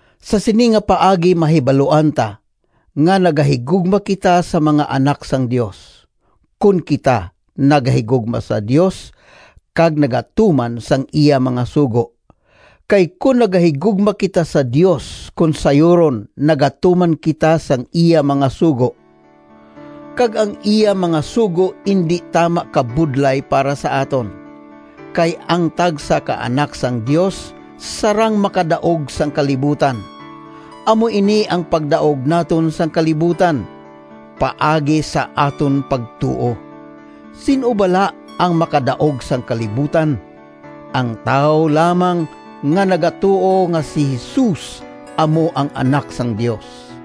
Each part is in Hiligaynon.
Sa sini nga paagi mahibaluan ta nga nagahigugma kita sa mga anak sang Dios, kon kita nagahigugma sa Dios kag nagatuman sang iya mga sugo. Kay kon nagahigugma kita sa Dios kon sayuron nagatuman kita sang iya mga sugo. Kag ang iya mga sugo indi tama kabudlay para sa aton, kay ang tagsa ka anak sang Dios sarang makadaog sang kalibutan. Amo ini ang pagdaog naton sang kalibutan: paagi sa aton pagtuo. Sin-o bala ang makadaog sang kalibutan? Ang tawo lamang nga nagatuo nga si Jesus amo ang Anak sang Dios.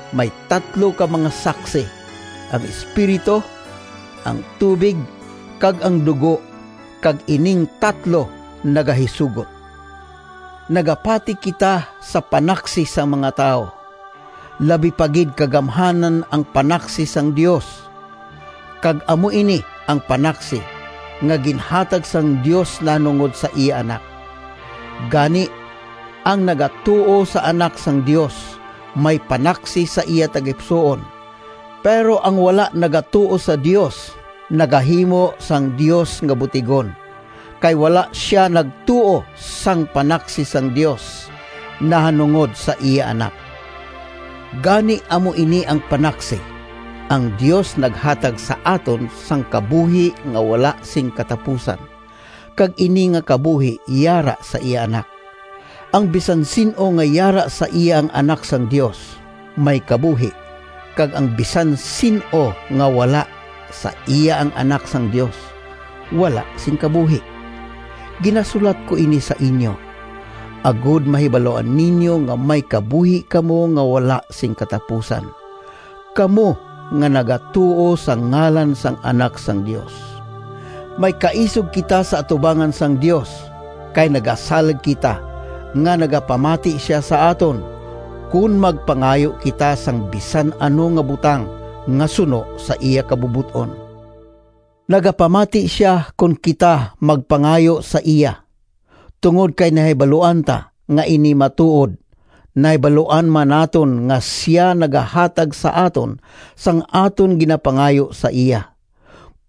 May tatlo ka mga saksi, ang Espiritu, ang tubig, kag ang dugo, kag ining tatlo nagahisugot. Nagapati kita sa panaksi sang mga tawo. Labi pa gid ka gamhanan ang panaksi sang Dios, kag amo ini ang panaksi nga ginhatag sang Dios nahanungod sa iya Anak. Gani, ang nagatuo sa Anak sang Dios may panaksi sa iya tagipusoon, pero ang wala nagatuo sa Dios, nagahimo sang Dios nga butigon, kay wala sia nagtuo sang panaksi sang Dios nahanungod sa iya Anak. Gani amo ini ang panaksi: ang Dios naghatag sa aton sang kabuhi nga wala sing katapusan, kag ini nga kabuhi yara sa iya Anak. Ang bisan sin-o nga yara sa iya ang Anak sang Dios may kabuhi, kag ang bisan sin-o nga wala sa iya ang Anak sang Dios wala sing kabuhi. Ginasulat ko ini sa inyo, agod mahibaluan ninyo nga may kabuhi kamo nga wala sing katapusan—kamo nga nagatuo sa ngalan sang Anak sang Dios. May kaisog kita sa atubangan sang Dios, kay nagasalig kita nga nagapamati sia sa aton, kon magpangayo kita sang bisan ano nga butang nga suno sa iya kabubot-on. Nagapamati sia kon kita magpangayo sa iya. Tungod kay nahibaluan ta nga ini matuod, nahibaluan man naton nga sia nagahatag sa aton sang aton ginapangayo sa iya.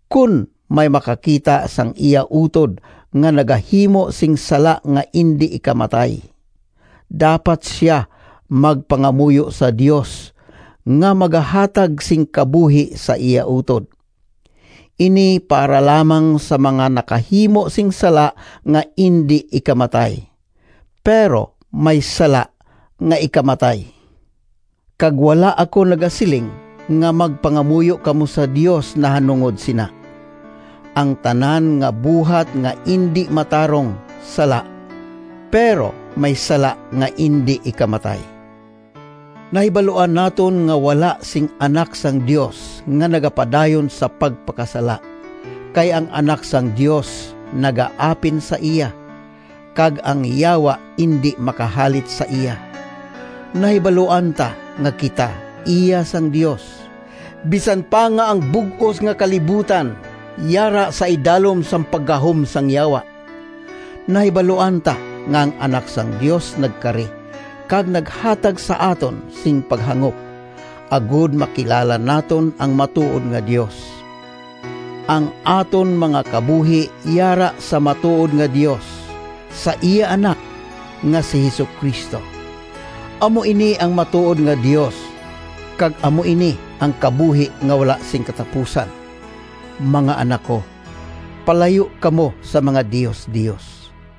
Kon may makakita sang iya utod nga nagahimo sing sala nga indi ikamatay, dapat sia magpangamuyo sa Dios nga magahatag sing kabuhi sa iya utod. Ini para lamang sa mga nakahimo sing sala nga indi ikamatay. Pero may sala nga ikamatay, kag wala ako nagasiling nga magpangamuyo kamo sa Dios nahanungod sina. Ang tanan nga buhat nga indi matarong, sala. Pero may sala nga indi ikamatay. Nahibaluan naton nga wala sing anak sang Dios nga nagapadayon sa pagpakasala, kay ang Anak sang Dios nagaapin sa iya, kag ang Yawa indi makahalit sa iya. Nahibaluan ta nga kita iya sang Dios, bisan pa nga ang bug-os nga kalibutan yara sa idalom sang paggahom sang Yawa. Nahibaluan ta nga ang Anak sang Dios nagkari kag naghatag sa aton sing paghangop, agod makilala naton ang matuod nga Dios. Ang aton mga kabuhi yara sa matuod nga Dios, sa iya Anak nga si Jesu-Cristo. Amo ini ang matuod nga Dios, kag amo ini ang kabuhi nga wala sing katapusan. Mga anak ko, palayo kamo sa mga diosdios!